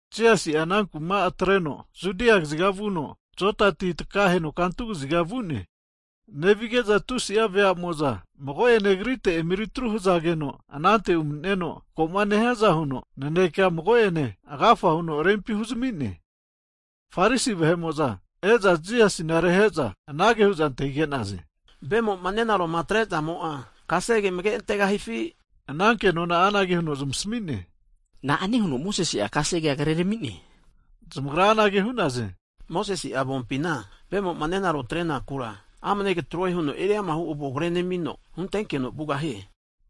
Jisasi'a anankuma atreno Judia kaziga vuno Joda ti takaheno kantu kaziga vu'ne. Nevige'za tusi'a veamo'za mago'ene Agrite emeri atru hzageno anante umani'neno, ko'ma nehiaza huno naneke mago'ene agafa huno rempi huzami'ne. Farisi vahe'mo'za e'za Jisasina rehe'za anage hu'za antahige'naze, vemoma nenaro atrezamo'a kasege amage antegahifi? Ana kenona'a anage huno zmasami'ne, na'a hiho huno Mosesi'a kasegea krerami'ne? Zamagra anage hu'naze, Mosesi'a avompina, vemo'a nenaro atrenakura amane katroe huno eriamahu avona kre nemino, huntekeno vugahie.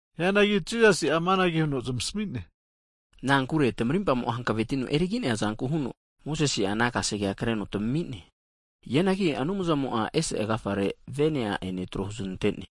Hianagi Jisasi'a amanage huno zamasmi'ne, na'ankure tmarimpamo'a hankavetino erigi'neazanku huno Mosesi'a ana kasegea kreno tamami'ne. Hianagi Anumzamo ese agafare vene a'ene trohu znante'ne.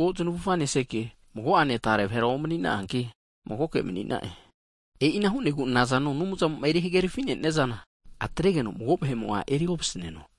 erimago znavufa neseke, mago'ane tare vahera omnina'anki, magoke mani'na'e. E'ina hu'negu nazano Anumzamo eri hagerafi neniazana, atregeno mago vahe'mo'a eri ovasaneno.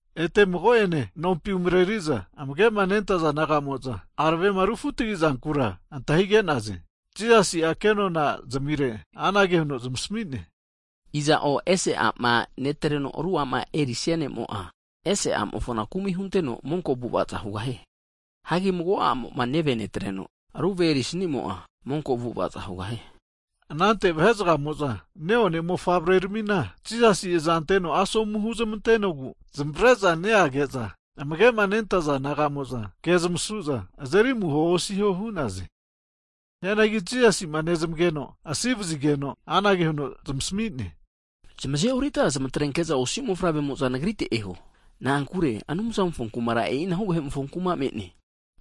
Ete mago'ene nompi umareri'za amage'ma nentaza disaipol naga'mo'za aravema refutagizankura antahige'naze. Jisasi'a ke'nona zamire anage huno zmasami'ne, iza'o ese a'ma netreno aru a'ma erisia ne'mo'a, ese a'mofona kumi hunteno monko avu'avaza hugahie. Hagi mago a'moma neve netreno, aru ve eri snimo'a, monko avu'ava hugahie. Anante vahe'zgamo'za ne'one mofavre ramina Jisasi azanteno asomu huzmantenogu zmavare'za neage'za, amage'ma nentaza disaipol nagamo'za ke zmasu'za azeri amuho osiho hu'naze. Hianagi Jisasima nezmageno asi vazigeno, anage huno zmasami'ne, zamazeorita zmatrenke'za osi mofavre'mo'za Nagrite eho, na'ankure Anumzamofo kumara e'inahu vahe'mofo kuma me'ne.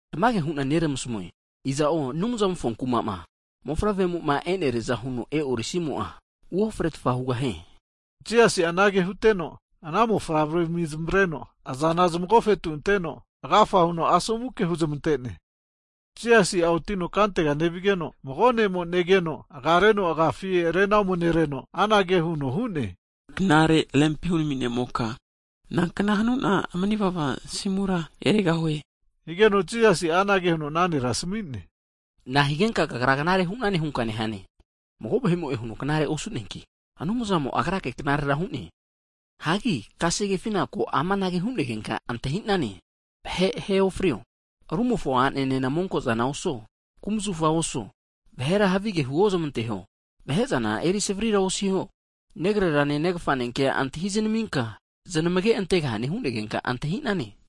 Tamage hu'na neramasamue, iza'o Anumzamofo kumama mofavre'moma eneriaza huno e'orisimo'a, uofretfa hugahie. Jisasi'a anage huteno, ana mofavre'rami zamavreno, azana zmagofetu anteno agafa huno asomu ke huzmante'ne. Jisasi'a otino kantega nevigeno mago ne'mo negeno, agareno agafi rena omenereno anage huno hu'ne, knare rempi hurami ne'moka, nankna hanuna manivava asimura erigahue? Higeno Jisasi'a anage huno ana nera asami'ne, na'a higenka kagra knare hu'nane hunka nehane? Mago vahe'mo'e huno knare osu'neanki, Anumzamo Agrake knarera hu'ne. Hagi kasegefina ko amanage hu'negenka antahinane, vahe ahe ofrio, rumofo a'enena monko'zana osuo, kumzafa oso, vahera havige huozmanteho, vahezana eri savarira osiho, negrerane negafane kea antahi znaminka znamage antegahane hu'negenka antahinane.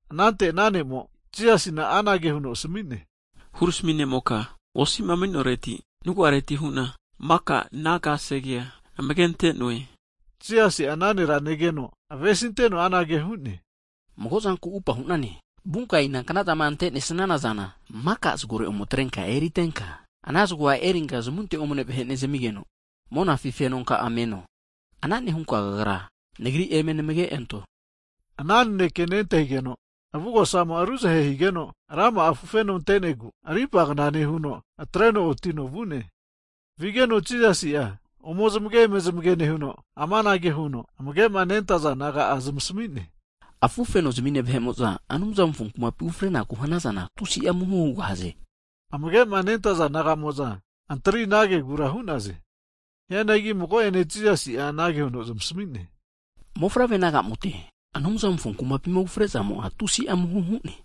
Anante ana ne'mo Jisasina anage huno asami'ne, Hurami ne'moka, osi'ma maninoreti, nagu'areti hu'na maka ana kasegea amage ante'noe. Jisasi'a ana nera negeno avesinteno anage hu'ne, mago'zanku upa hu'nane, vunka inanknazama ante'nesnana zana, maka zagore ome atrenka eritenka, ana zago erinka zamunte omane vahe nezamigeno, monafi fenonka'a meno. Ana nehunka kagra, Nagri eme namage'anto. Ana naneke nentahigeno, avugosamo ruzahe higeno, rama'a afufeno ante'negu rimpagna nehuno atreno oti'no vu'ne. Vigeno Jisasi'a ome zmage eme zmage nehuno, amanage huno amage'ma nentaza disaipol naga'a zmasmi'ne, Afufeno zmine vahe'mo'za Anumzamofo kumapi ufrenaku'ma hanazana, tusi'a amuho hugahaze! Amagema nentaza disaipol nagamo'za antri ana kegura hu'naze. Hianagi mago'ene Jisasi'a anage huno zmasami'ne, mofavre naga'mote, Anumzamofo kumapima ufrezamo'a tusi'a amuho hu'ne!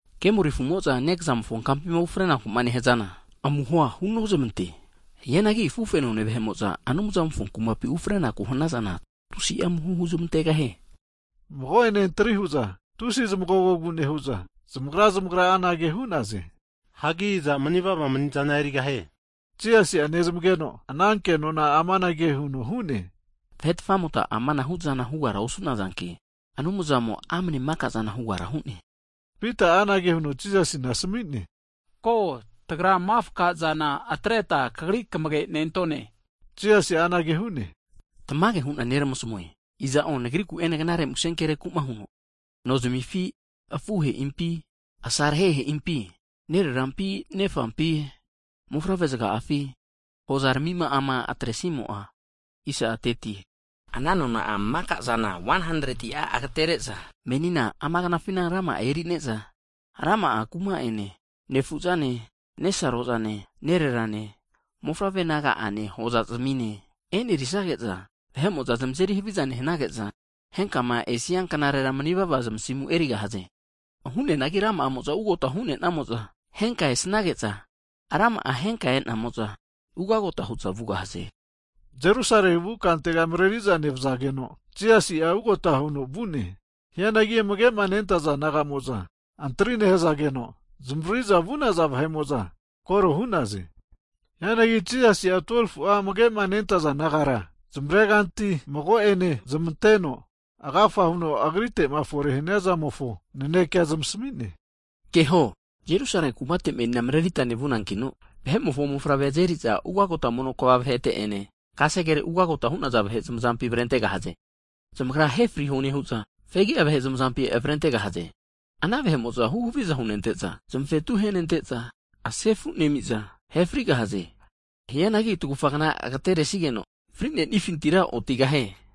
Kemoli afumo'za nekazamofo kampima ufrenakuma nehazana amuhoa hunozmante, hianagi afufenone vahe'moza Anumzamofo kumapi ufre'naku hanazana, tusi amuho huzmantegahie. Mago'ene antri hu'za tusi zmagogogu nehu'za, zamagra zmagra anage hu'naze, hagi iza manivava manizana erigahie? Jisasi'a nezmageno ana kenona amanage huno hu'ne, Vahe tfamota amanahu'zana hugara osu'nazanki, Anumzamo'a amane maka'zana hugara hu'ne. Pita'a anage huno Jisasina asmi'ne ko, tagra mafka'zana atreta kagri kamage'nentone. Jisasi'a anage hu'ne, tamage hu'na neramasamue, iza'o Nagriku ene knare muse kereku'ma huno nozmifi, afuhe'impi, asarhehe'impi, nererampi, nefampi, mofavre'zga'afi hoza ramima'ama atresimo'a, ana nona'a maka'zana 100ti'a agatere'za menina ama knafina rama'a e'neriza, rama'a kuma'ene, nefu'zane nesaro'zane nererane mofavre' naga'ane, hoza zmine e'nerisage'za, vahe'mo'za zmazeri haviza nehanige'za, henkama esia knarera manivava zmasimu erigahaze. Hianagi rama'amo'za ugagota hu'nenamo'za, henka esnage'za, rama'a henka e'nenamo'za, ugagota hu'za vugahaze. Jerusale vu kantega mareri'za nevazageno, Jisasi'a ugota huno vu'ne. Hianagi amagema nentaza naga'mo'za antri nehzageno, zmavaririza vu'naza vahe'mo'za koro hu'naze. Hianagi Jisasi'a 12fu'a amage'ma nentaza disaipol nagara zmare kanti mago'ene zmanteno, agafa huno agritema fore haniazamofo naneke zmasami'ne. Keho, Jerusale kumate marerita meni nevunankino, Vahe'mofo Mofavrea azeriza ugagota mono kva vahete'ene kasegere ugota hu'naza vahe zmazampi avrentegahaze. Zamagra ahe friho nehu'za, fegi'a vahe zmazampi avrentegahaze. Ana vahe'mo'za huhaviza hunente'za, zmavetu ahenente'za sefunemiza, ahe frigahaze. Hianagi tagufa kna agetere'sigeno frinefintira otigahie.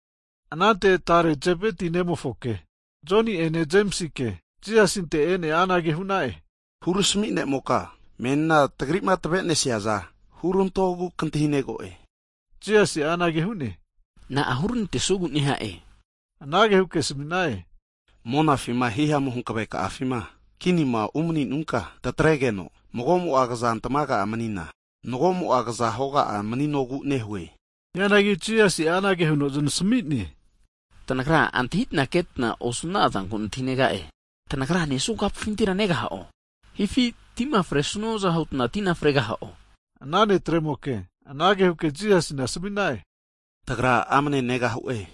Anante tare Zebeti nemofoke Joni'ene Jemisike Jisasinte e'ne anage hu'na'e, Hurami ne'moka, menima tagrima tave'manesiza hurantogu kantahinego'e? Jisasi'a anage hu'ne, na'a huranantesuegu neha'e? Anage huke asami'na'e, monafima hihamu hanaveka'afima kinima umaninunka tatregeno, mago'mo'a kazantmaga manina, mago'mo'a kaza hoga'a maninogu nehue. Hianagi Jisasi'a anage huno znasami'ne, tanagra antahitna ketna osu na'azanku nantahinega'e! Tanagra nesua kapufintira negaha'o, hifi tima fresuaza hutna, tina fregaha'o? Ana netremoke anage huke Jisasina asami'na'e, tagra amane negahu'e huke hakeno,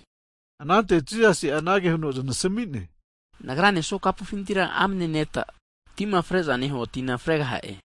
anante Jisasi'a anage huno znasami'ne, Nagrama nesua kapufintira amane neta, tima frezama nehua tina fregaha'e.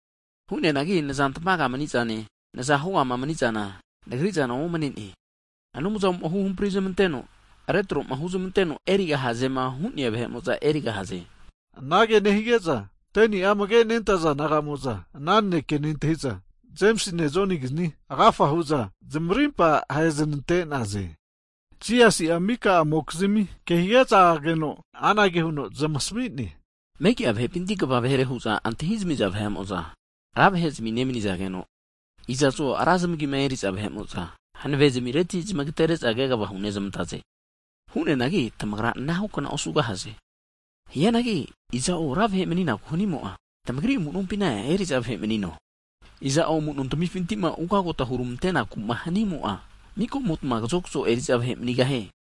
Hu'neanagi nazantmaga mani'zane, naza hogama manizana Nagri'zana omane'ne, Anumzamo'ma huhampri zamanteno, retroma huzmanteno erigahazema hu'nea vahe'mo'za erigahaze. Anage nehige'za 10'a amage'ma nentaza disaipol naga'mo'za ana naneke nentahi'za, Jemisine Jonigizni agafa hu'za zmarimpa aheznante'naze. Jisasi'a mika'amokizmi ke higeza ageno anage huno zamasmine, megi'a vahepinti kva vahere hu'za antahizamiza vahe'mo'za ra vahe'zimi nemanizageno, iza'zo ra zmagima eri'za vahe'mo'za hanave zmireti zmagatere'za kegva hunezmantaze. Hu'neanagi tamagra anahukna osugahaze. Hianagi iza'o ra vahe maninaku hanimo'a, tmagri amu'nompina eriza vahe manino. Iza'o amuno tamifintima ugagota hurmante'nakuma hanimo'a, mika'motma kazo kazo eriza vahe manigahie.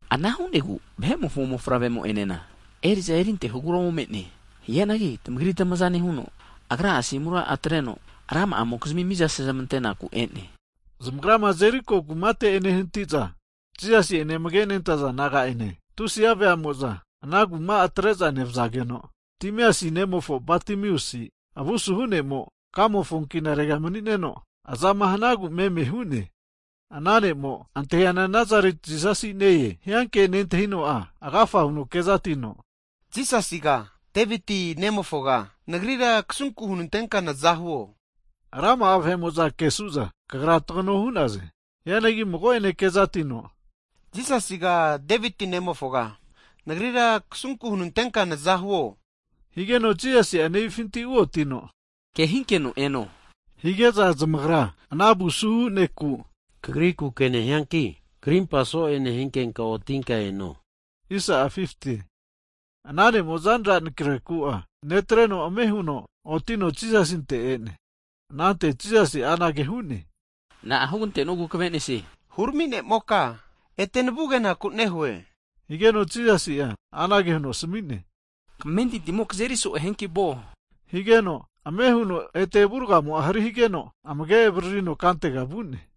Ana hu'negu Vahe'mofo Mofavre'mo enena, eri'za erintehogura ome'ne. Hianagi tamagri tmaza nehuno, Agra'a asimura atreno rama'mokizmi miza sezmantenaku e'ne. Zamagrama Jeriko kumate ehnatite'za, Jisasi'ene amage'ma nentaza disaipol naga'ene tusi'a veamo'za ana kuma atre'za nevazageno, Timeasi nemofo Batamiasi avusuhu ne'mo, kamofo ankenarega mani'neno, azama hanagu meme hu'ne. Ana ne'mo antahiama Nazareti Jisasi ne-e hia ke nentahino'a, agafa huno kezatino, Jisasiga Deviti nemofoga nagrira kasunku hunantenka nazahuo! Rama'a vahe'mo'za kesu'za, kagra tagano hu'naze. Hianagi mago'ene kezatino, Jisasiga Deviti nemofoga nagrira kasunku hunanteka nazahuo! Higeno Jisasi'a nevifinti uotino, Ke hinkeno eno hige'za, zamagra ana avusuhu neku, kagriku ke nehianki krimpamo'a so'e nehinkenka otinka eno hu'za hu'naze. Ana ne'mo zanra anakreku'a netreno ame huno otino Jisasinte e'ne. Anante Jisasi'a anage hu'ne, na'a hugante'nuegu kavenesie? Hurami ne'moka, ete navu kenaku nehue. Higeno, Jisasi'a anage huno asami'ne, kamentintimo kazeri so'e hianki vuo higeno, ame huno avurgamo'a ete hari higeno amage' avaririno kantega vu'ne.